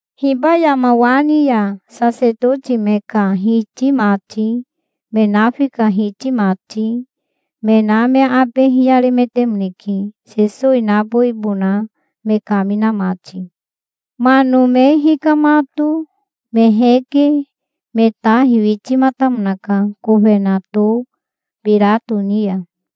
Hiba yama wa ni ya sasetoti me ka hiti mati, me nafi ka hiti mati, me na me abe hiyaremetemoneke, Sesowi nabowibona me kamina mati. Mano me hikamato me heke me ta hiwitimatamonaka kofenato Birato ni ya.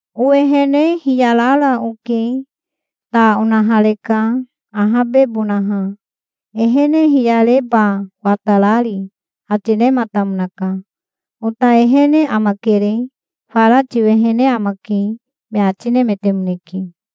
"Owehene hiyarara oke. Ta onahareka ahabebonaha, ehene hiyareba watarari", ati nematamonaka. "Ota ehene amakere. Fara tiwehene amake", me ati nemetemoneke.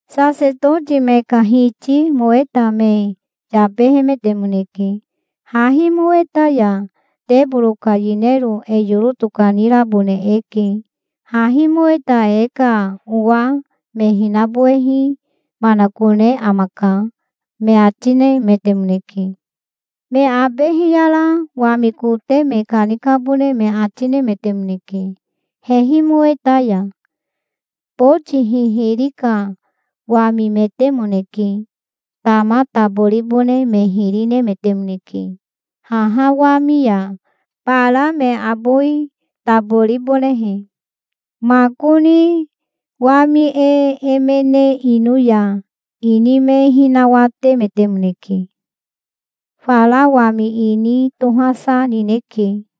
Sasetoti me ka hiti moweta me yabehemetemoneke. "Hahi moweta ya teboro ka yinero e yoro tokanirabone eke. Hahi moweta e ka owa me hinabowehi manakone amaka", me ati nemetemoneke. Me abe hiyara wami kote me kanikabone me ati nemetemoneke hehi moweta ya. Boti hihiri ka wamimetemoneke. Tama taboribone me hiri nemetemoneke haha wami ya, bara me abowi taboribonehe. Makoni wami e emene ino ya ini me hinawatemetemoneke. Fara wami ini tohasa nineke.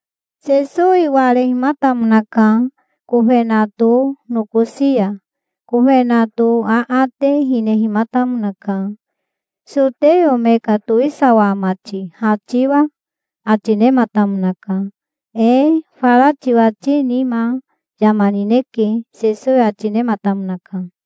Sesowi warehimatamonaka kofenato nokosi ya. Kofenato aate hinehimatamonaka. "Soteo me ka towisawa ama ti, ha tiwa?" ati nematamonaka. "Ee, fara tiwati nima yama nineke", Sesowi ati nematamonaka.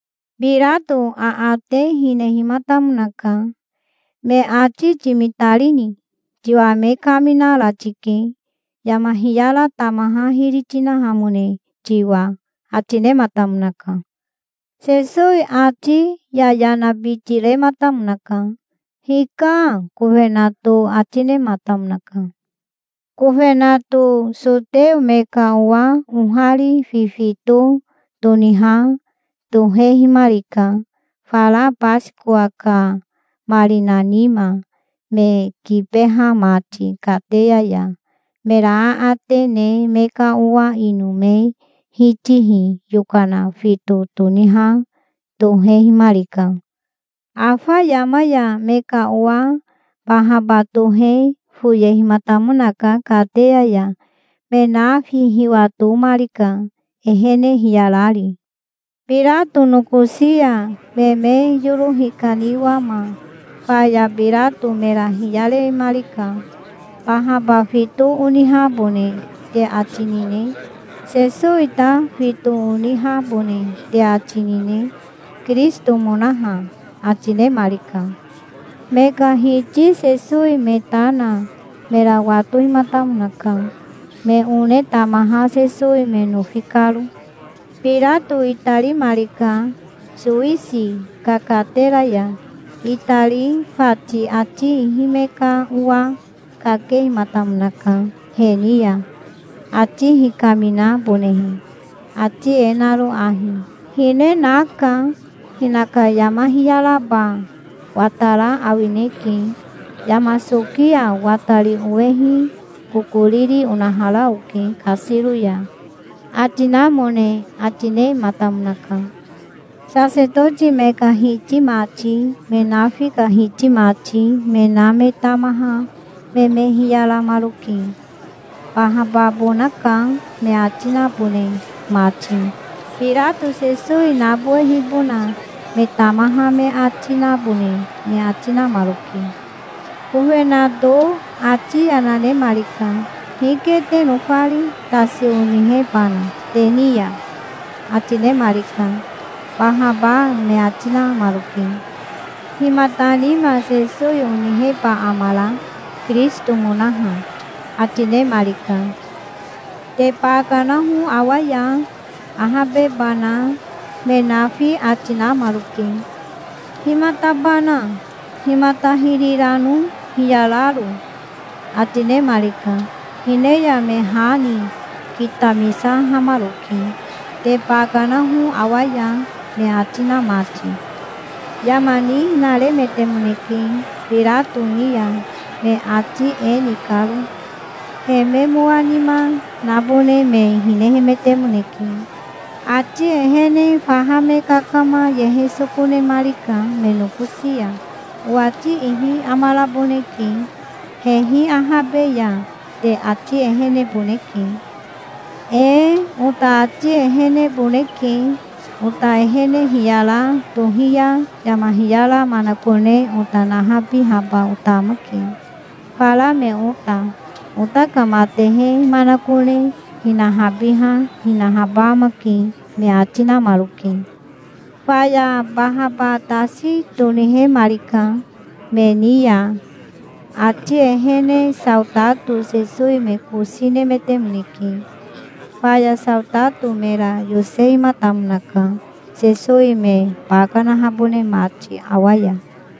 Birato aate hinehimatamonaka. "Me ati timitarini? Tiwa me kaminara tike, yama hiyara tamaha hiri tinahamone tiwa", ati nematamonaka. Sesowi ati yayanabiti rematamonaka. "Hika", kofenato ati nematamonaka. Kofenato soteo me ka owa ohari fifito toniha tohehimarika, fara Basikowa ka marina nima, me kibeha mati kateya ya. Mera aate ne me ka owa ino me hitihi yokana fito toniha tohehimarika. Afa yama ya me ka owa Bahaba tohe foyehimatamonaka kateya ya. Me nafi hiwatomarika, ehene hiyarari. Birato nokosi ya me me yoro hikaniwama faya Birato mera hiyaremarika. "Bahaba fito onihabone te ati nine? Sesowi ta fito onihabone te ati nine, Kirisitomonaha?" ati nemarika. Me ka hiti Sesowi me ta na mera watohimatamonaka, me one tamaha Sesowi me nofi karo. Birato itarimarika sowisi ka katera ya. Itari fati ati ihi me ka owa kakehimatamonaka he ni ya, ati hikaminabonehe, ati e naro ahi: "Hine naka. Hinaka yama hiyaraba watara awineke. Yama soki ya watari owehi kokoriri onahara oke kasiro ya", ati namone ati nematamonaka. Sasetoti me ka hiti mati, me nafi ka hiti mati, me na me tamaha me me hiyaramaroke, "Bahababonaka", me ati nabone mati. Birato Sesowi nabowehibona me tamaha me ati nabone me ati namaroke. Kofenato ati yana nemarika. "Hike te nofari, tasi onihebana te ni ya?" ati nemarika. "Bahaba", me ati namaroke. "Himata nima Sesowi oniheba amara, Kirisitomonaha?" ati nemarika. "Te ba kanaho awa ya, ahabebana", me nafi ati namaroke. "Himatabana? Himata hiri rano hiyararo?" ati nemarika. Hine ya me ha ni kitamisahamaroke, "Te ba kanaho awa ya", me ati na mati. Yama nihinaremetemoneke Birato ni ya, me ati e ni karo. He me mowa nima nabone me hinehemetemoneke. Ati ehene faha me kakama yehe soko nemarika me nokosi ya. "Owati ihi amaraboneke, hehi ahabe ya. Te ati eheneboneke". "Ee, ota ati eheneboneke. Ota ehene hiyara tohi ya yama hiyara manakone ota nahabihaba ota amake, fara me ota. Ota ka matehe manakone hinahabiha hinahaba amake", me ati namaroke. Faya Bahaba tasi tonihemarika me ni ya. Ati ehene saotato Sesowi me kosi nemetemoneke. Faya saotato mera yosehimatamonaka, Sesowi me ba kanahabone mati awa ya.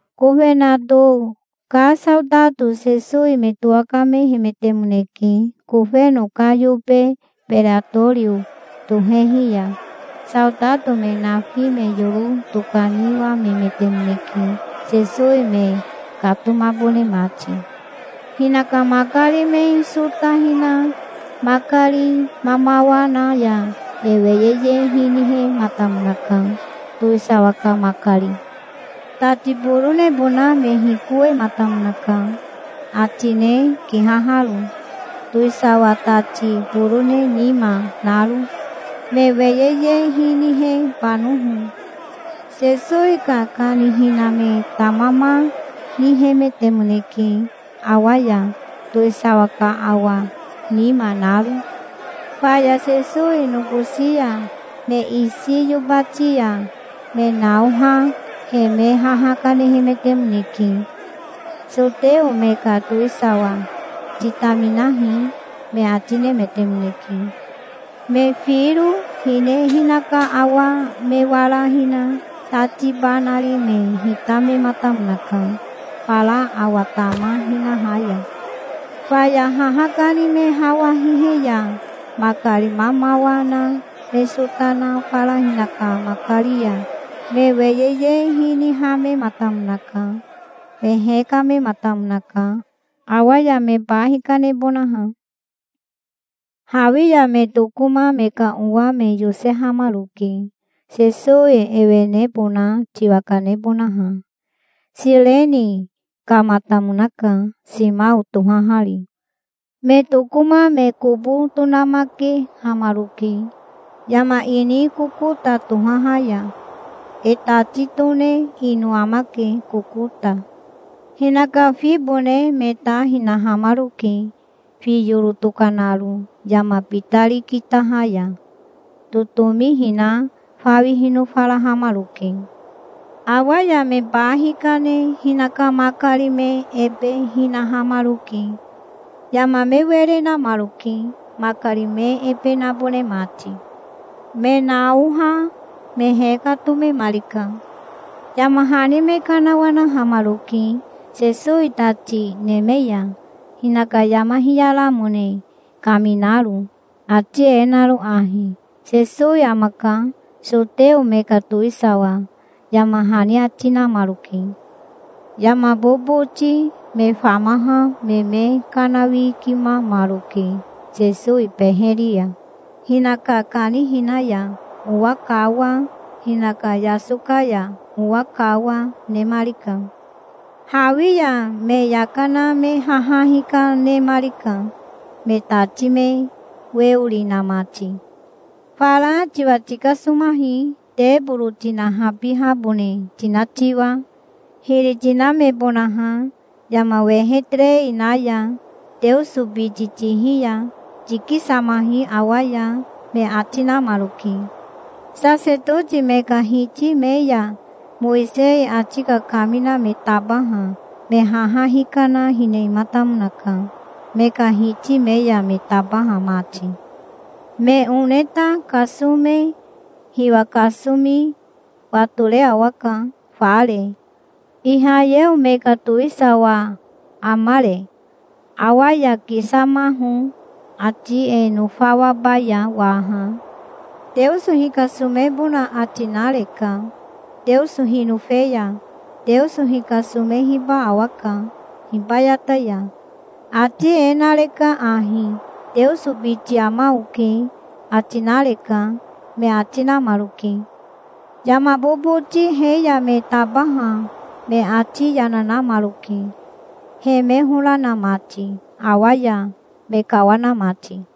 Kofenato ka saotato Sesowi me towakamehemetemoneke kofeno ka yobe Beretorio tohehi ya. Saotato me nafi me yoro tokaniwamemetemoneke, Sesowi me katomabone mati. Hinaka makari me sota hina makari mamawa na ya me weyeye hinihematamonaka, towisawa ka makari. Tati boronebona me hikowemataka, atine kihaharo, towisawa tati borone nima naro, me weyeye hinihebanoho. Sesowi ka kanihina me tamama nihemetemoneke awa ya, towisawa ka awa nima naro. Faya Sesowi nokosi ya me isi yobati ya me naoha he me haha kanehemetemoneke. "Soteo me ka towisawa, titaminahi", me ati nemetemoneke. Me firo hine hinaka awa me wara hina tati ba nari me hitamematamonaka, fara awa tama hinaha ya. Faya haha kani me hawa hihe ya makari mamawa na me sota na fara hinaka makari ya me weyeye hinihamematamonaka. Me hekamematamonaka, awa ya me ba hikanebonaha. Hawi ya me tokoma me ka owa me yosehamaroke, Sesowi ewenebona tiwa kanebonaha. Sireni kamatamonaka, Simao tohahari. Me tokoma me kobo tonamakehamaroke, yama ini Kokota tohaha ya. E tati tone ino amake Kokota. Hinaka fibone me ta hinahamaroke, fi yoro tokanaro, yama bitari kitaha ya. Totomi hina fawi hinofarahamaroke. Awa ya me ba hikane hinaka makari me ebe hinahamaroke. Yama me were namaroke, makari me ebe nabone mati. Me naoha me hekatomemarika. Yama hani me kanawanahamaroke Sesowi tati neme ya, hinaka yama hiyaramone kaminaro, ati e naro ahi: "Sesowi amaka, soteo me ka towisawa", yama hani ati namaroke. Yama boboti me famaha me me kanawikimamaroke Sesowi beheri ya. Hinaka kanihina ya owa kawa, hinaka yasoka ya owa kawa, nemarika. Hawi ya me yaka na me haha hikanemarika, me tati me weori na mati. "Fara tiwa tikasomahi, teboro tinahabihabone tina tiwa, hiri tinamebonaha yama wehe terei na ya. Teoso biti tihi ya tikisamahi awa ya", me ati namaroke. Sasetoti me ka hiti me ya Mowisei ati kakamina me tabaha me haha hikana hinematamonaka, me ka hiti me ya me tabaha mati. "Me one ta kasome hiwa kasomi watore awaka fare. Ihayeo me ka towisawa amare? Awa ya kisamaho, ati e nofawabaya waha. Teoso hikasomebona ati nareka. Teoso hinofe ya Teoso hikasomehiba awaka hibayata ya. Ati e nareka ahi: 'Teoso biti ama oke', ati nareka", me ati namaroke. Yama boboti he ya me tabaha me ati yana, namaroke, he me hora na mati, awa ya me kawana mati.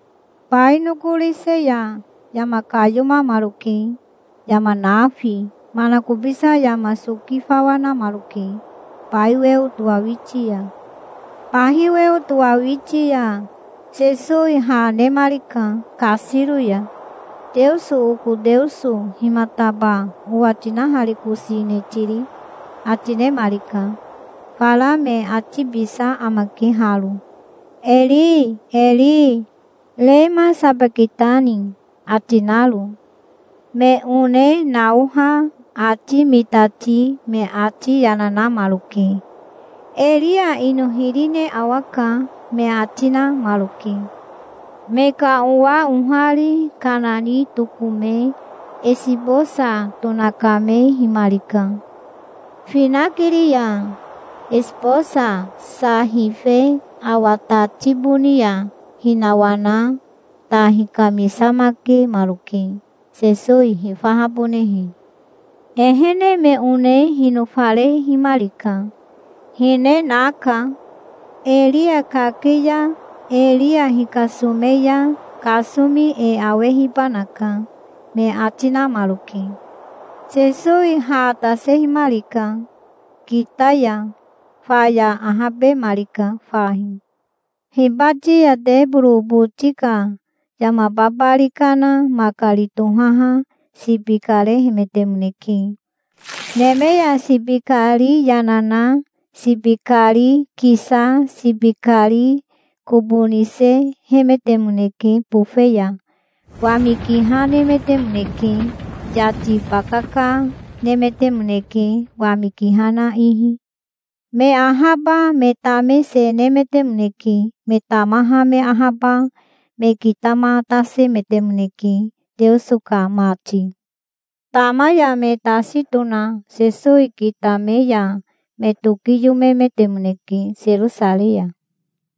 Bai nokorise ya yama kayomamaroke, yama nafi. Manakobisa yama soki fawa namaroke bai weo towawiti ya. Bahi weo towahawiti ya Sesowi ha nemarika kasiro ya. "Teoso, oko Teoso, himataba owa tinaharikosine tiri?" ati nemarika. Fara me atibisa amake haro: "Eri, eri, rema sabakitani?" ati naro. Me one naoha ati mitati me ati yana namaroke. "Eria ino hiri ne awaka", me ati namaroke. Me ka owa ohari kana ni tokome esibosa tonakamehimarika. Finakiri ya esibosa sa hife awa tati boni ya hinawana ta hikamisamakemaroke, Sesowi hifahabonehe. Ehene me one hinofarehimarika. "Hine naka. Eria kake ya Eria hikasome ya kasomi e awehibanaka", me ati namaroke. Sesowi ha tasehimarika kita ya. Faya ahabemarika fahi. Hibati ya teboro boti ka yama babari kana makari tohaha sibi karehemetemoneke. Neme ya sibi kari yana na sibi kari kisa sibi kari kobo nisehemetemoneke bofe ya. Wami kiha nemetemoneke. Yati bakaka nemetemoneke wami kiha na ihi. Me ahaba me tame se nemetemoneke. Me tamaha me ahaba me kitamatasemetemoneke, Teoso ka mati. Tama ya me tasi tona Sesowi kitame ya me tokiyomemetemoneke Serosarei ya.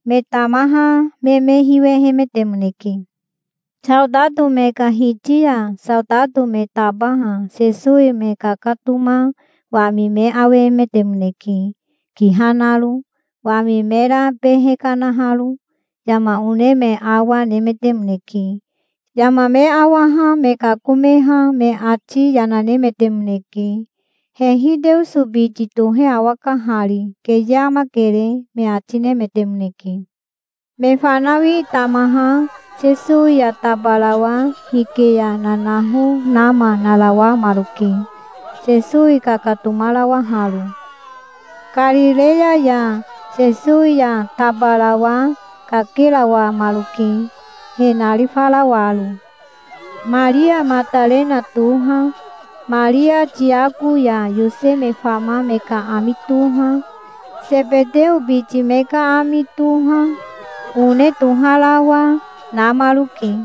Me tamaha me me hiwehemetemoneke. Saotato me ka hiti ya saotato me tabaha Sesowi me kakatoma wami me awehemetemoneke, kiha naro, wami mera behe kanaharo. Yama one me awa, nemetemoneke. Yama me awaha me kakomeha me ati yana nemetemoneke. "Hehi Teoso biti tohe awaka hari. Keye amakere", me ati nemetemoneke. Me fanawi tamaha Sesowi ya tabarawa hike ya nanaho nama narawamaroke, Sesowi kakatomarawaharo. Karireya ya Sesowi ya tabarawa kakerawamaroke, he narifarawaro. Maria Matarena toha, Maria Tiako ya Yose me fama me ka ami toha, Sebeteo biti me ka ami toha, one toharawa, namaroke.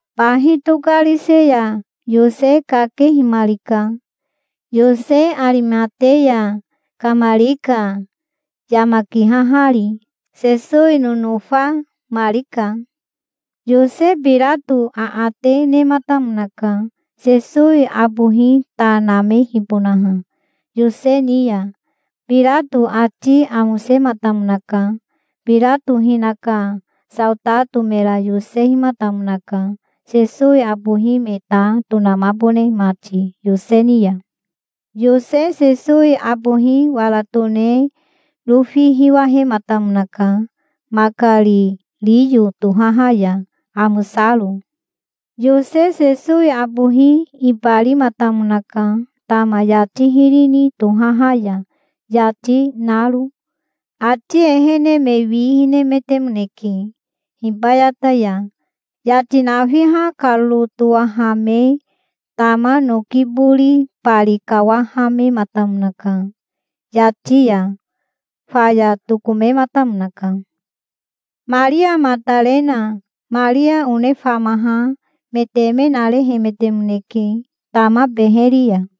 Bahi tokarise ya Yose kakehimarika. Yose Arimateya kamarika, yama kihahari. Sesowi nonofamarika. Yose Birato aate nematamonaka, Sesowi abohi ta namehibonaha Yose ni ya. Birato ati amosematamonaka. Birato hinaka saotato mera yosehimatamonaka, Sesowi abohi me ta tonamabone mati Yose ni ya. Yose Sesowi abohi wara tone rofi hiwahematamonaka makari riyo tohaha ya, amosaro. Yose Sesowi abohi ibarimatamonaka tama yati hiri ni tohaha ya, yati naro. Ati ehene me wi hinemetemoneke hibayata ya. Yati nafiha karoro towahame tama noki bori bari kawahamematamonaka yati ya. Faya tokomematamonaka. Maria Matarena Maria one famaha me teme narehemetemoneke, tama beheri ya.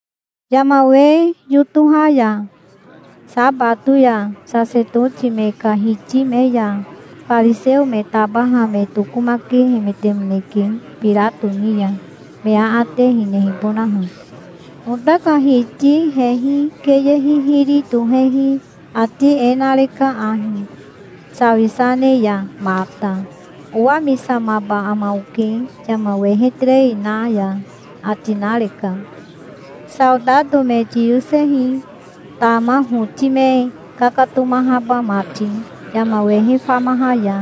Yama we yotoha ya, sabato ya, sasetoti me ka hiti me ya fariseo me tabaha me tokomakehemetemoneke Birato ni ya, me aate hinehibonaha. "Ota ka hiti hehi keye hihiri tohehi ati e nareka ahi, sawisa ne ya mata: 'Owamisamaba ama oke yama wehe terei na ya', ati nareka. Saotato me tiyosehi, tama hoti me kakatomahaba mati, yama wehe famaha ya.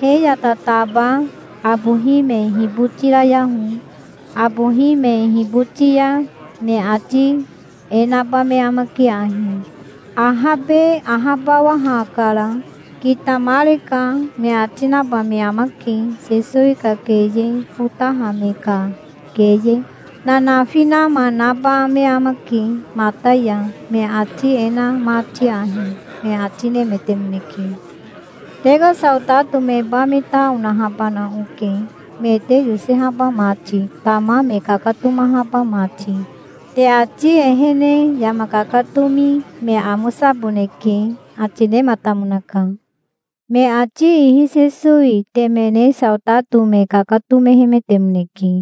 He ya tataba abohi me hibotirayaho. Abohi me hiboti ya me ati e naba me amake ahi: 'Ahabe ahabawahakara. Kitamareka', me ati naba me amake. Sesowi ka keye fotaha me ka keye nanafi nama naba me amake mata ya, me ati e na mati ahi", me ati nemetemoneke. "Te ka saotato meba me ta onahabana oke, me te yosehaba mati, tama me kakatomahaba mati. Te ati ehene yama kakatomi me amosaboneke", ati nematamonaka. Me ati ihi Sesowi temene saotato me kakatomehemetemoneke.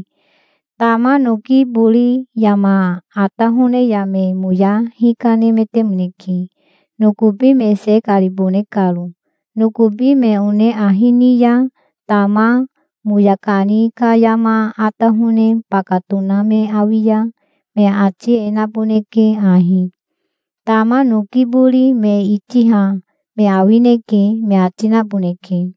Tama noki bori yama atahone ya me moya hikanemetemoneke, nokobi me se karibone karo. Nokobi me one ahi ni ya tama moya kani ka yama atahone baka tona me awi ya me ati e naboneke ahi: "Tama noki bori me itiha me awineke", me ati naboneke.